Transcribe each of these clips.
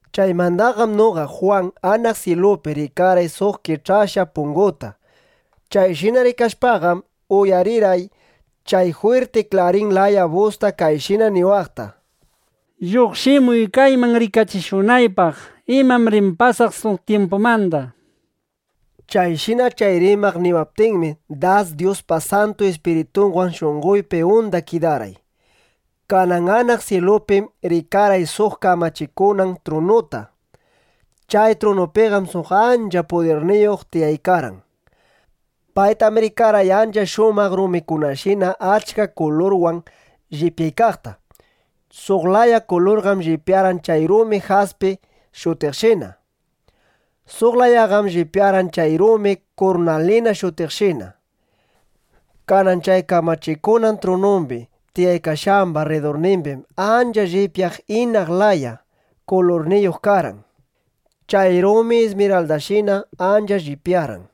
Chaymandaqam noqa Jwan anaq syilupi rikarqay suq kich'akashqa punguta. Chayshina rikashpaqam, uyarirqay chay jwirti klarin laya busta kayshina niwaqta: —Lluqshimuy kayman rikachishunaypaq imam rin pasaq suq tyimpumanda, nishpa. Chayshina chay rimaq niwaptinmi, das Dyuspa Santu Ispiritunwan shunqoypi unda kidarqay. Kanan anaq syilupim rikarqay suq kamachikunan trunuta. Chay trunupiqam suq ancha pudirniyuq tiyaykarqan. Paytam rikarqay ancha shumaq rumikunashina achka kulurwan llipyaykaqta. Suq laya kulurqam llipyarqan chay rumi jaspi shutiqshina. Suq layaqam llipyarqan chay rumi kurnalina shutiqshina. Kanan chay kamachikunan trunumbi tiyaykashqamba rridurnimbim ancha llipyaq inap laya (chirapa laya) kulurniyuq karqan. Chay rumi ismiraldashina ancha llipyarqan.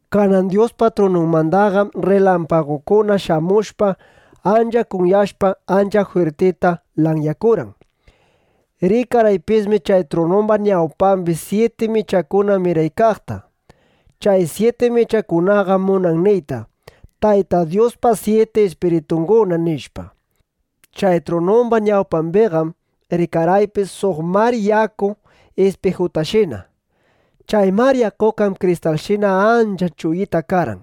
Kanan Dyuspa trununmandaqam rrilampagukuna shamushpa, ancha kunyashpa, ancha jwirtita lanyakurqan. Rikarqaypismi chay trunumba ñawpambi syiti michakuna miraykaqta. Chay syiti michakunaqam munan niyta: Tayta Dyuspa syiti ispiritunguna, nishpa. Chay trunumba ñawpambiqam rikarqaypis suq mar yaku ispijutashina. Chay mar yakuqam kristalshina ancha chuyita karqan.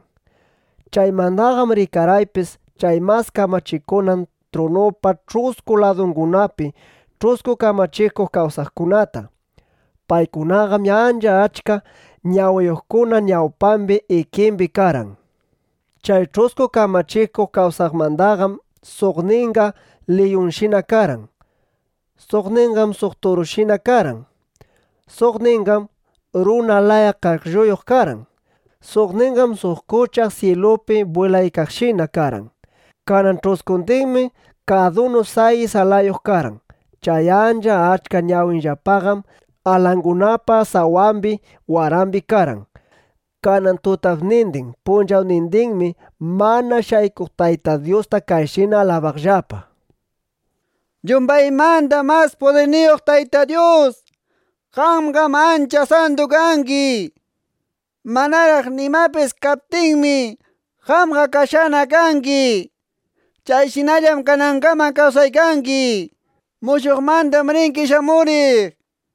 Chaymandaqam rikarqaypis chay mas kamachikunan trunupa ch'usku ladungunapi ch'usku kamachikuq kawsaqkunata. Paykunaqam ancha achka ñawiyuqkuna ñawpambi ikimbi karqan. Chay ch'usku kamachikuq kawsaqmandaqam suqninqa liyunshina karqan. Suqninqam suq turushina karqan. Suqninqam runa laya qaqllayuq karqan. Suqninqam suq kuchaq syilupi bwilaykaqshina karqan. Kanan ch'uskundinmi kadunu sayis alayuq karqan. Chay ancha achka ñawinllapaqam alangunapa sawambi, warambi karqan. Kanan tutapnindin punchawnindinmi mana shaykuq Tayta Dyusta kayshina alabaqllapa: ¡Yumbaymanda mas pudirniyuq Tayta Dyus, qamqam ancha santu kangi! Manaraq nimapis kaptinmi, qamqa kashqana kangi. Chayshinallam kanangaman kawsaykangi. Mushuqmandam ringi shamuriq, nishpa.